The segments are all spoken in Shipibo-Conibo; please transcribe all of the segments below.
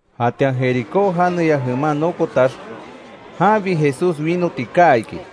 Jatian Jericó janeya jeman nokotax, janbi Jesús winoti kaa iki.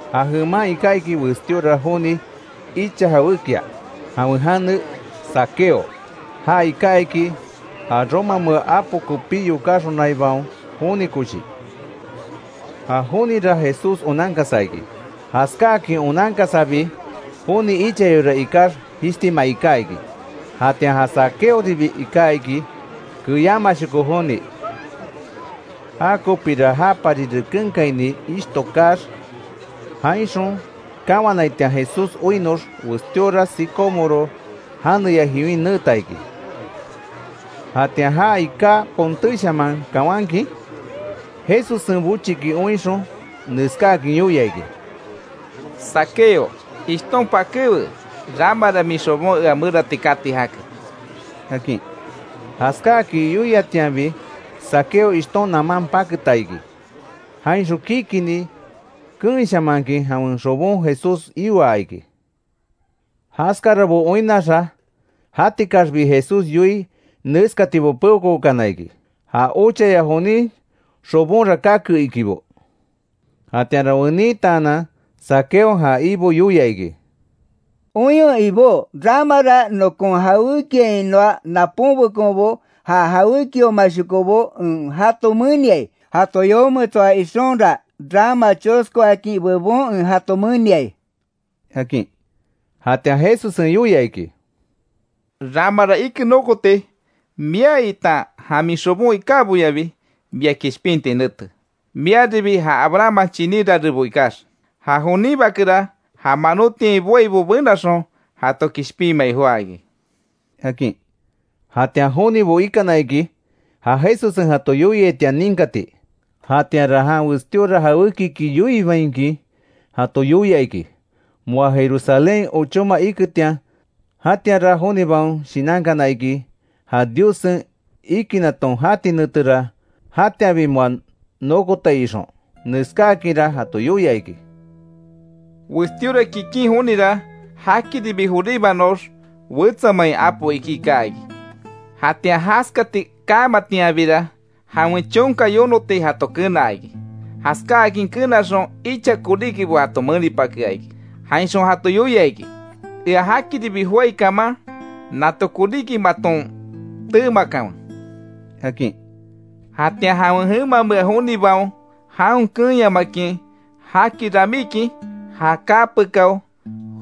Ja jeman iká iki westíora joni icha jawékia, jawen jane Zaqueo; ja iká iki, ja romamea apo kopí yokáxonaibaon joni koshi. Ja jonira Jesús onankasa iki, jaskáakin onankasabi joni ichayora ikax, jishtima iká iki. Jatian ja Zaqueoribi iká iki keyámashoko joni, Jakopira japari rekenkaini ishto kaax, jainxon kawanaitian Jesús oinnox, westíora sicómoro janeya jiwin neeta iki. Jatian ja iká pontéshaman kawankin, Jesussen bochiki oinxon, neskáakin yoia iki: —Zaqueo ishton pakéwe, ramara min xobon ea merati kati jake —akin. Jaskáakin yoiatianbi Zaqueo ishton naman paketa iki, jainxon kikini keenshamankin jawen xobon Jesús ioa iki. Jaskarabo oinnaxa, jatikaxbi Jesús yoii neskatibo peokookana iki: Ja ochaya jonin xobonra kake, ikibo. Jatianra wenitaanan Zaqueon ja Ibo yoia iki: —Oinwe Ibó; ramara nokon jawékiainoa napónbekonbo, ja jawékiomashokobo, en jato meniai. Jato yometsoa ixonra, rama choskoakin bebon en jato meniai —akin. Jatian Jesussen yoia iki: —Ramara ike nokoti, mia itan ja min xobon ikáboyabi, mia kishpinti nete, miaribi ja Abrahamman chiní rarebo ikax. Ja jonin Bakera, ja manótiain boaibo benaxon jato kishpinmai joá iki —akin. Jatian jonibo ikana iki, ja Jesussen jato yoiaitian ninkati; jatianra jan westíora jawékiki yoinbainkin jato yoia iki, moa Jerusalén ochóma iketian, jatianra jonibaon shinankana iki; ja Diossen ikinaton jati netera jatianbi moa nokotai ixon. Neskáakinra jato yoia iki: “Westíora kikin jonira, jakiribi joríbanox, wetsa main apo ikí kaa iki. Jatian jaskati kamatianbira jawen chonka yonoti, jato kenaa iki. Jaskáakin kenaxon icha koríkibo jato menipakea iki. Jainxon jato yoia iki: ‘Ea jakiribi joái kaman nato koríki maton teemakanwe’, akin. Jatian jawen jemamea jonibaon jaon keenyamakin jaki ramíkin, ja kaa pekáo,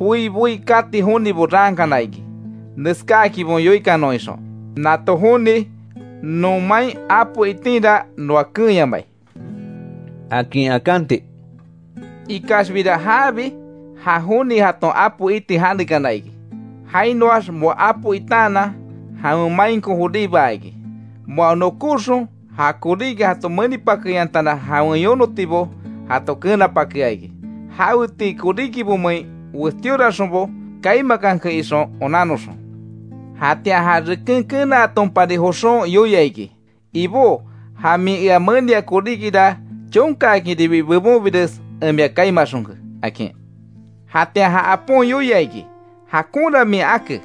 joi boí kati jonibo raankana iki. Neskáakinbo yoikanon ixon: ‘Nato joni non main apo itinra noa keenyamai’, akin akanti. Ikaxbira jaabi ja joni jaton apo iti janekana iki; jainoax moa apo itaanan jawen mainko joríbaa iki. Moa nokóxon ja koríki jato menipakeyantana jawen yonotibo jato kenapakea iki. Jawetii koríkimein westíoraxonbo kaimakanke ixon onannoxon. Jatian ja reken kenaatonpari joxon yoia iki: ‘Ibó ja min ea menia koríkira chonkaakinribi bebonbires en mia kaimaxonke’, akin. Jatian ja apon yoia iki: ‘Jakonra min ake,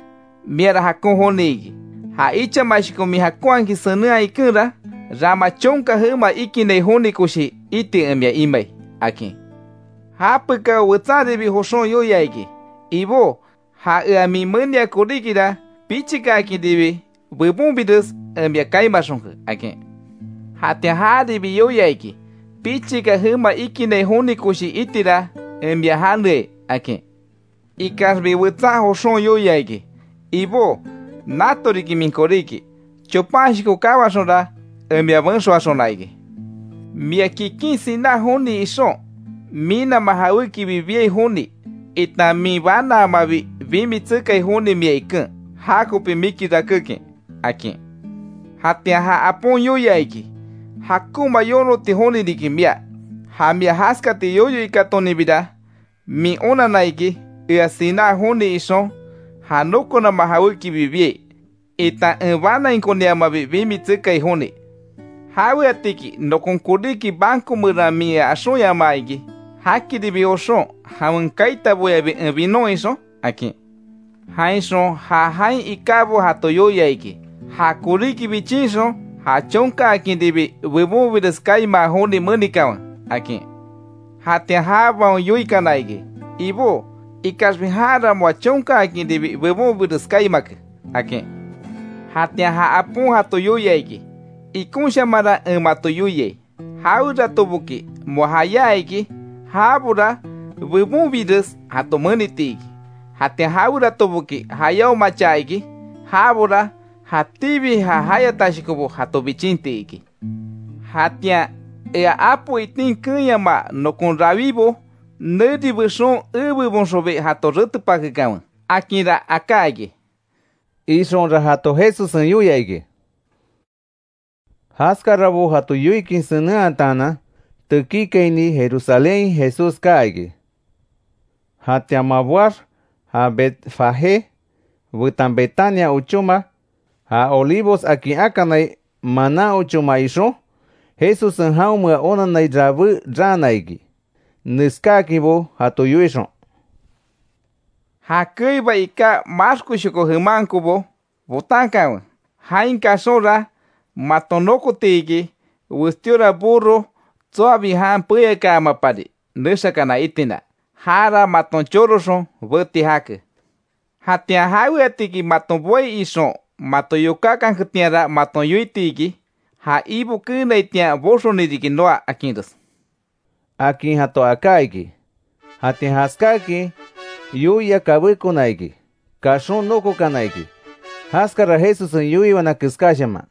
miara jakon joni iki. Ja ichamashoko min jakonhakin senenhaa ikenra, rama chonka jema ikinai joni koshi iti en mia imai’, akin. Japekao wetsanribi, joxon yoia iki: ‘Ibó ja ea min menia koríkira, pichikaakinribi bebonbires en mia kaimaxonke’, akin. Jatian jaribi yoia iki: ‘Pichika jema ikinai joni koshi itira en mia janeai’, akin. Ikaxbi wetsan joxon yoia iki: ‘Ibó nato riki min koríki, chopanshoko kawaxonra en mia benxoaxona iki, mia kikin siná joni ixon, minama jawékibi biai joni, itan min banaamabi, bimi tsekai joni mia iken, jakopi miki rakékin’, akin. Jatian ja apon yoia iki: ‘Jakonma yonoti joni riki mia, ja mia jaskati yoyo ikátoninbira, min onanna iki, ea siná joni ixon ja nokonama jawékibi biai, itan en banainkoniamabi bimi tsekai joni. ¿Jaweatiki nokon koríki banco meran min ea axonyamaa iki, jakiribi joxon jawen kaitaboyabi en binon ixon?’ akin. Jainxon ja jain ikábo jato yoia iki: ‘Ja koríki bichinxon ja chonkaakinribi bebonbires kaimaa joni menikanwe’, akin. Jatian jabaon yoikana iki: ‘Ibó, ¡Ikaxbi janra moa chonkaakinribi bebonbires kaimake!’ akin. Jatian ja apon jato yoia iki: ‘Ikonshamanra en mato yoiai; jaweratoboki moa jayá iki, jabora bebonbires jato meniti iki. Jatian jaweratoboki jayáomacha iki, jabora jatíbi ja jayatashokobo jato bichinti iki. Jatian ea apo itin keenyama nokon rawibo, neri bexon ebebonxonbi jato retepakekanwe, akinra aká iki’”, ixonra jato Jesussen yoia iki. Jaskarabo jato yoikin senenhataanan, tekíkaini Jerusalénhain Jesús kaa iki. Jatian moa boax ja Betfagé betan Betania ochóma, ja Olivos akin akanai, manan ochóma ixon Jesussen jaonmea onanai rabé raana iki. Neskáakinbo jato yoixon: —Ja keiba iká maxkoshoko jemankobo botankanwe; jain kaxonra maton nokoti iki, westíora burro tsoabi jan peyakaamapari, nexakana itina. Jara maton choroxon beti jake. Jatian jaweatiki maton boai ixon, mato yokákanketianra maton yoiti iki, ja Ibo keenaitian boxoni riki noa, akinres —akin jato aká iki. Jatian jaskáakin yoia kabékona iki, kaxon nokokana iki, jaskara Jesussen yoiwana keskáshaman.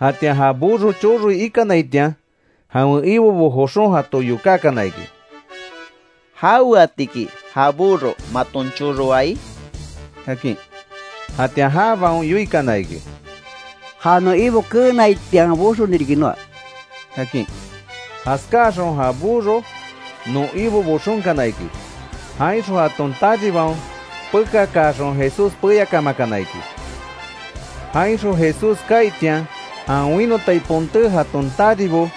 Jatian ja burro choroi ikanaitian, jawen ibobo joxon jato yokákana iki: —¿Jaweatiki ja burro maton choroai? —akin. Jatian jabaon yoikana iki: —Ja non Ibo keenaitian boxoni riki noa —akin. Jaskáaxon ja burro non Ibo boxonkana iki, jainxon jaton taribaon pekakaaxon, Jesús peyakamakana iki. Jainxon Jesús kaaitian, jan winotai ponté jaton taribo,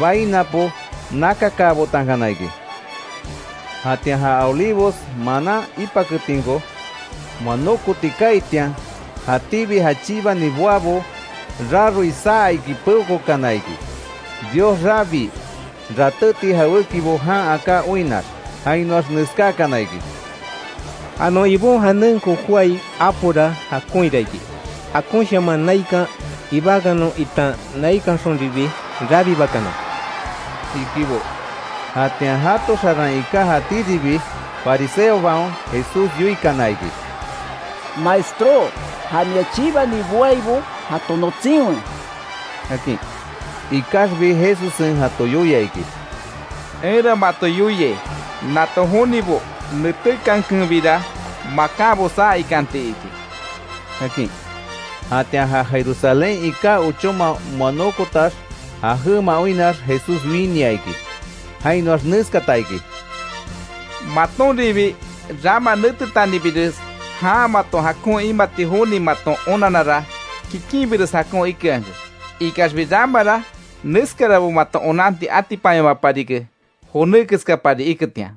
bai napo nakakaabotankana iki. Jatian ja Olivos manan ipaketinko, moa nókoti kaaitian, jatíbi ja chibani boabo, raroi saa iki peokookana iki, Dios rabii, ratéti jawékibo jan aká oinnax. Jainoax neskákana iki: —¡Ja non Ibon janenko jóai apora jakonhira iki! ¡Jakonshaman naikan ibakanon itan naikanxonribi rabibakanon! —ikibo. Jatian jato xaran iká jatíribi fariseobaon Jesús yoikana iki: —Maestró, ja mia chibani boaibo jato notsinwe —akin. Ikaxbi Jesussen jato yoia iki: —Enra mato yoiai, nato jonibo netékankenbira, makanbo saa ikanti iki —akin. Jatian ja Jerusalén iká ochóma moa nokotax, ja jema oinnax, Jesús winia iki. Jainoax neskata iki: “¡Matonribi rama netetanibires, jan mato jakon imati joni maton onanara kikinbires jakon ikeanke! Ikaxbi ramara neskarabo maton onanti atipanyamaparike, joné keskapari iketian.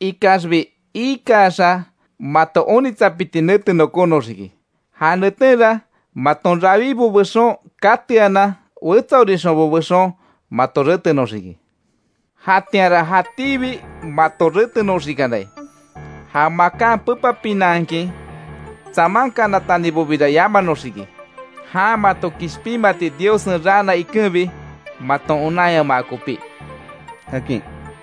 Ikaxbi iikaxa mato onitsapiti nete nokónoxiki. Ja netenra maton rawibo bexon kateanan wetsaorixonbo bexon mato retenoxiki. Jatianra jatíbi, mato retenoxikanai, ja makan pepapinanhakin tsamankanatanibobira yamanoxiki, jan mato kishpinmati Diossen raana ikenbi, maton onanyama kopí”, akin.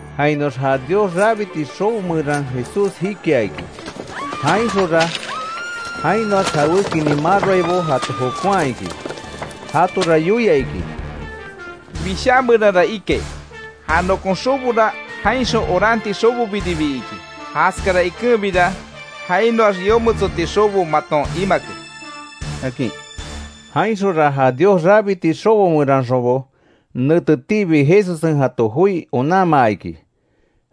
Jainoax ja Dios rabiti xobo meran Jesús jikia iki. Jainxonra jainoax jawékinin maroaibo jato jokonhaa iki. Jatora yoia iki: —Wishaa meranra ikai: ‘Ja nokon xobora jainxon oranti xobobiribi iki’. Jaskara ikenbira jainoax yometsoti xobo maton imake —akin. Jainxonra ja Dios rabiti xobo meranxonbo, netetiibi Jesussen jato joi onanmaa iki.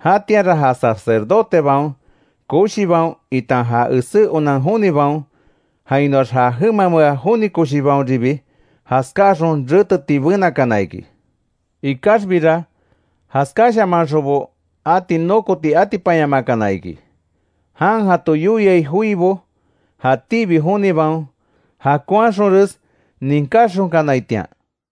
Jatianra ja sacerdotebaon koshibaon, itan ja esé onan jonibaon, jainoax ja jemamea joni koshibaonribi, jaskáaxon reteti benakana iki. Ikaxbira jaskashamanxonbo ati nókoti atipanyamakana iki; jan jato yoiai joibo, jatíbi jonibaon jakonhaxonres ninkáxonkanaitian.